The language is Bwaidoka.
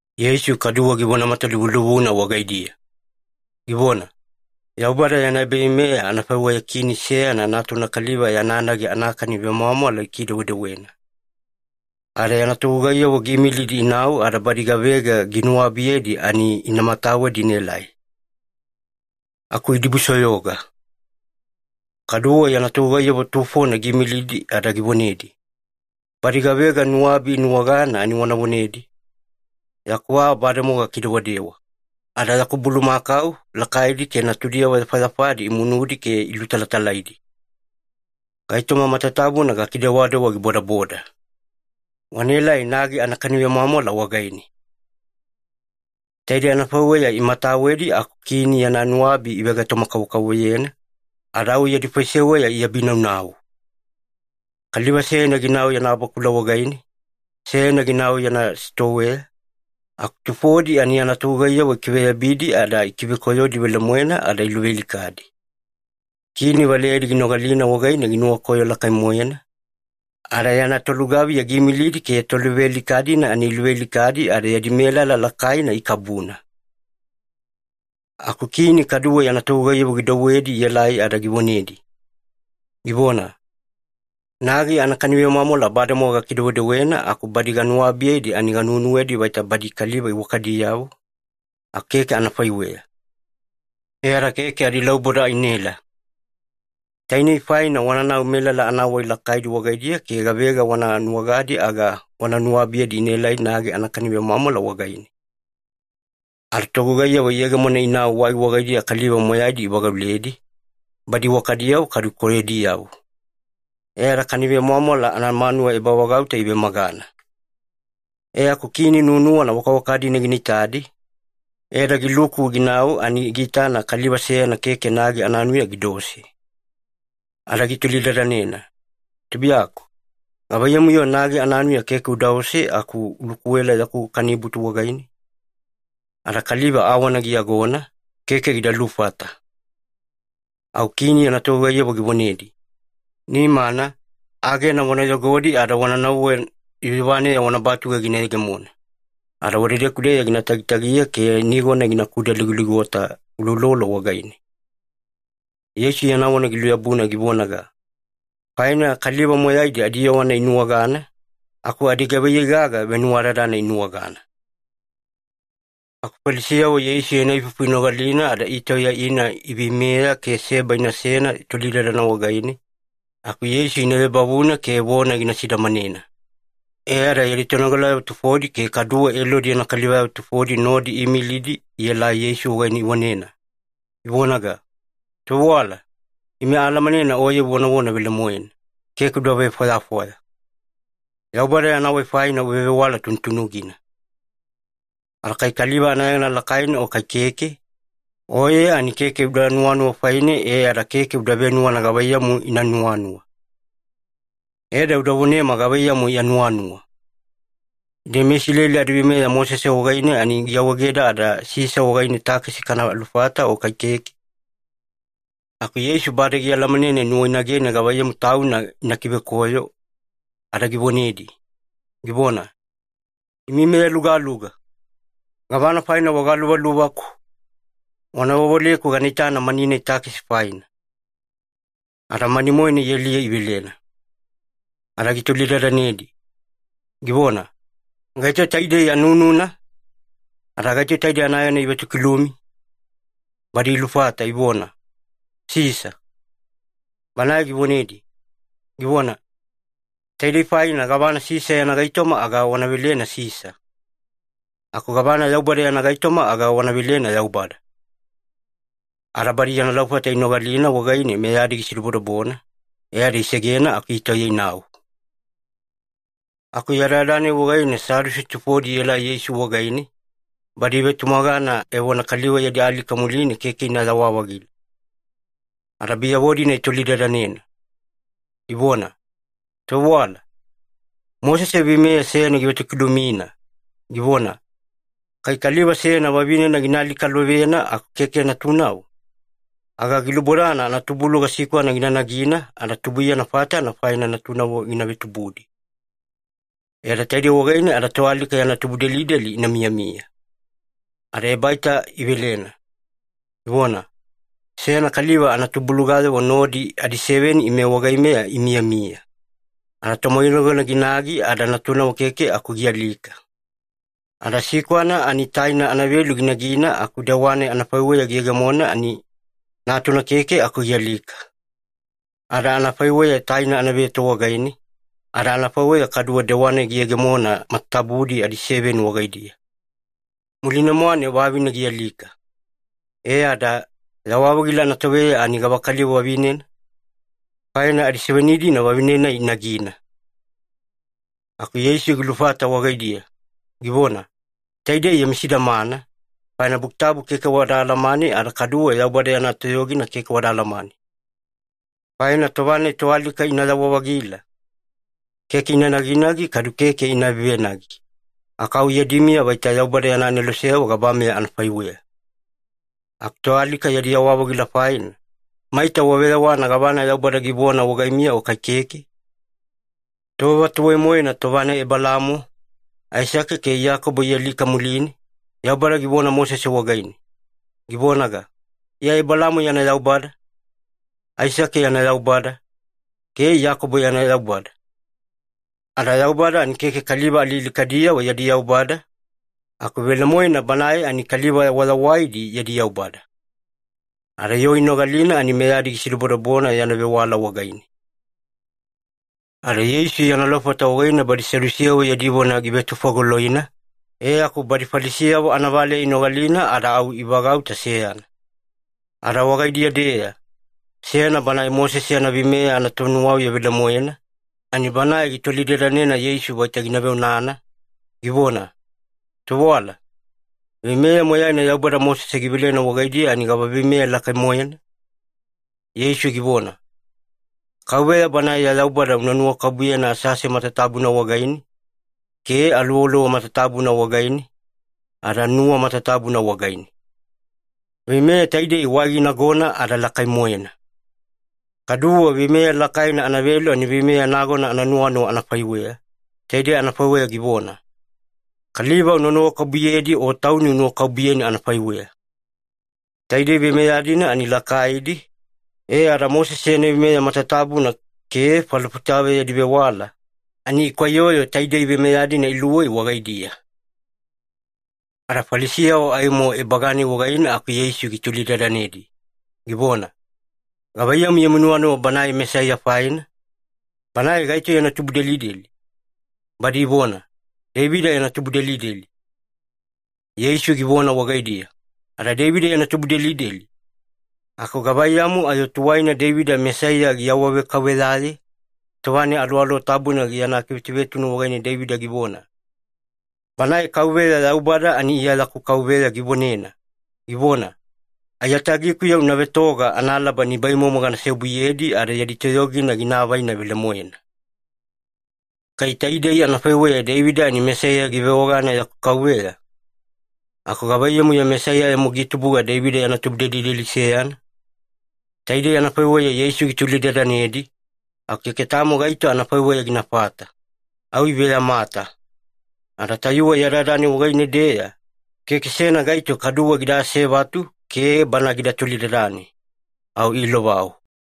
Yeisu kaduwe givona matalivulivuna wagaidiya, givona, “Yaubada yana ebaveimeya anafaiweya kini seyana natuna kaliva yana nagi anakani vemwamwala gikidewedewena. Ada yana togugaiyavo giimilidi inau ada badi gavega ginuwabiyedi ani ina matawedi inaelai. Aku idibusoyoga. “Kaduwe yana togugaiyavo tufona giimilidi ada givonedi, ‘Badi gavega nuwabi inuwagana ani wana vonedi, “Yaku aa bademowa gakidewadewa, ada yaku bulumakau lakaidi ke natudiyavo yafayafadi imunudi ke ilutalatalaidi. Gaitoma matatabuna gakidewadewa gibodaboda. Wanaelai nagi anakani vemwamwala wagaine.”; “Taidei anafaiweya imatawedi aku kini yana nuwabi ivegaitoma-kavokavovoyena, ada au yadi faiseweya iabinaunau. Kaliva seyana ginau yana bakula wagaine, seyana ginau yana sitoweya, aku tufodi ani yana togugaiyavo ikiveyabidi ada ikivekoyodi velemoena ada iluvealikadi. Kini valeyadi ginogalina wagaine ginuwakoyo lakai-moena, ada yana tolugaviya giimilidi ke toluvealika-dina ani iluvealikadi ada yadi melala lakaina ikabuna. “Aku kini kaduwe yana togugaiyavo gidouwedi ielai ada givonedi, givona, ‘Nagi anakani vemwamwala bademowa gakidewedewena aku badi ganuwabiyedi ani ganuwenuwedi vaita badi kaliva iwakadiyavo, aku keke anafaiweya. E ada keke adilauboda inaela. Tainei faina wananau melala anawai lakaidi wagaidiya ke gavega wana nuwagadi aga wana nuwabiyedi inaelai nagi anakani vemwamwala wagaine.’ Ada togugaiyavo iyegemona inau wai wagaidiya kaliva moyaidi ivagauledi, badi iwakadiyavo kadu koyodiyavo. E ada kani vemwamwala anamanuwa ebavagauta ivemagana. “E aku kini nuwanuwana wakawaka-dina gina itadi, e ada giluku ginau ani giitana kaliva seyana keke nagi ananuya gidaose. Ada gitolidadanena, ‘Tubuiyaku, gavaiyamu-yo nagi ananuya keke udaose aku ulukuela yaku kanibutu wagaine?’ Ada kaliva awana giyagona, keke gida lufata. “Au kini yana togugaiyavo givonedi, ‘Nimana, agena wana yogodi ada wana nauwe yuyuvaneya wana batuge gina yegemona. Ada wadedeku-deya gina tagitagiya ke nigona gina vekudaligoligota uloulolo wagaine.’” Yeisu yana vona giluyabuna givonaga, “Faina kaliva moyaidi adiyowana inuwagana, aku adigavaiyei gaga venuwadadana inuwagana.” Aku Falisiyavo Yeisu yana ifufu inogalina ada itauya ina iveimeya ke seba inasena tolidadana wagaine, aku Yeisu ina vebavuna ke vona gina sidamanena. E ada yadi tonogalayavo tufodi ke kaduwe Elodi yana kalivayavo tufodi nodi iimilidi ielai Yeisu wagaine ivonena, ivonaga, “Tovewala, ime aalamanena Oye uvonavona velemoena, keke uda vefwayafwaya. Yaubada yana wai faina uvevewala tunutunugina. Ada kai kaliva anayegana lakaina o kai keke, Oye ani keke uda nuwanuwa faine e ada keke uda venuwana gavaiyamu ina nuwanuwa. E ada uda vonema gavaiyamu ya nuwanuwa. Ide meIsileli adaveimeya Mosese wagaine ani giawaegeda ada Sisa wagaine takesi kana lufata o kai keke?” Aku Yeisu bade gialamanena inuwainage gavaiyamu tauna ina kivekoyo, ada givonedi, givona, “Imi meyalugaluga! Gavana faina wagaluvaluvaku? Wana vewaleku gana itana mani-nai takesi faina.” Ada mani-moena ialiye ivelena. Ada gitolidadanedi, givona, “Gaito taidei anununa? Ada gaito taidei anayegana ivetokilumi?” Badi ilufata ivona, “Sisa.” Banae givonedi, givona, “Taidei faina gavana Sisa yana gaitoma aga wana velena Sisa. Aku gavana Yaubada yana gaitoma aga wana velena Yaubada.” Ada badi yana laufata inogalina wagaine meyadi gisidobodobona, e ada isegena aku itauya inau. Aku yadayada-nai wagaine Sadusi tufodi ielai Yeisu wagaine, badi ivetumagana evona kaliva yadi alika muline keke inayawa-vagila. Ada biyavo-dina itolidadanena, ivona, “Tovewala, Mosese veimeya seyana givetokilumina, givona, ‘Kai kaliva seyana vavinena gina alikalovena aku keke natunavo, aga gilubodana anatubuluga sikwana gina nagina, ada tubuiyana fatana faina natunavo gina vetubudi. E ada taidei wagaine ada toalika yana tubudelideli ina miyamiya.’” Ada ebaita ivelena, ivona, “Seyana kaliva anatubulugayavo nodi adiseveni ime wagaimeya imiyamiya. Ada tomoinagona ginagi ada natunavo keke aku gialika. Ada sikwana ani taina anavelu ginagina aku dewa-nai anafaiweya giyegemona ani, natuna keke aku gialika. Ada anafaiweya taina anaveto wagaine, ada anafaiweya kaduwe dewa-nai giyegemona matatabudi adiseveni wagaidiya. Muline-mwane vavine gialika. E ada, yawa-vagila anatoveya ani gavakaliva vavinena? Faina adiseveni-dina vavine-nai inagina.” Aku Yeisu gilufata wagaidiya, givona, “Taidei yami sidamana, faina Buki Tabu keke wada alamane ada kaduwe Yaubada yana toyogina keke wada alamane. Faina tova-nai toalika inayawa-vagila, keke ina naginagi kadu keke ina vevenagi, aku au yadi miya vaita Yaubada yana aneloseyavo gabameya anafaiweya. Aku toalika yadi yawa-vagila faina, maita waveyawana gavana Yaubada givona wagaimiya o kai keke? Tova tuwai-moena tova-nai Ebelaamo, Aisake ke Iyakobo ialika muline, Yaubada givona Mosese wagaine, givonaga, ‘Iya Ebelaamo yana Yaubada, Aisake yana Yaubada, ke Iyakobo yana Yaubada.’ Ada Yaubada ani keke kaliva alialikadiyavo yadi Yaubada, aku velemoena Banae ani kaliva wayawaidi yadi Yaubada.” Ada yoo inogalina ani meyadi gisidobodobona yana vewala wagaine. Ada Yeisu yana laufata wagaine badi Sadusiyavo yadi vona givetufagoloina, e aku badi Falisiyavo anavaleya inogalina ada au ivagauta seyana. Ada wagaidiya-deya, seyana banae Mosese yana veimeya anatonuwauya velemoena, ani banae gitolidadanena Yeisu vaita gina veonana, givona, “Tovewala, veimeya moyaina Yaubada Mosese givelena wagaidiya ani gava veimeya lakai-moena?” Yeisu givona, “KAUVEYA Banae ya Yaubada una nuwakabubuyena asease matatabuna wagaine, ke aluwaluwa matatabuna wagaine, ada nuwa matatabuna wagaine. Veimeya taidei wai ginagona ada lakai-moena. Kaduwe veimeya lakaina anavelu ani veimeya nagona ananuwanuwa anafaiweya. Taidei anafaiweya givona, ‘Kaliva una nuwakabubuyedi o tauni unuwakabubuyeni anafaiweya.’ Taidei veimeya-dina ani lakaidi, e ada Mosese yana veimeya matatabuna ke falofitayavo yadi vewala, ani ikwaiyoyo taidei veimeya-dina iluwei wagaidiya.” Ada Falisiyavo aimo ebaga-nai wagaine aku Yeisu gitolidadanedi, givona, “Gavaiyamu yami nuwanuwa Banae Mesaiya faina? Banae gaito yana tubudelideli?” Badi ivona, “Deivida yana tubudelideli.” Yeisu givona wagaidiya, “Ada Deivida yana tubudelideli, aku gavaiyamu ayo tuwaina Deivida Mesaiya giawavekauveyaye, tova-nai Aluwaluwa Tabuna yana kivetuvetunu wagaine Deivida givona, ‘Banae KAUVEYA Yaubada ani Iya yaku Kauveya givonena, givona, “Aiyatagikuya una vetoga analaba nibaimomo gana seobuyedi ada yadi toyogina gina avaina velemoena.”;” “Kai taidei anafaiweya Deivida ani Mesaiya givewagana ‘yaku Kauveya’, aku gavaiyamu-yo Mesaiya aimo gitubuga Deivida yana tubudelideli seyana?” Taidei anafaiweya Yeisu gitolidadanedi, aku keke tamo gaito anafaiweya ginafata, au iveyamata. Ada tayuwe yadayada-nai wagaine-deya, keke seyana gaito kaduwe gida asevatu ke Bana gida tolidadane. Au iilovau.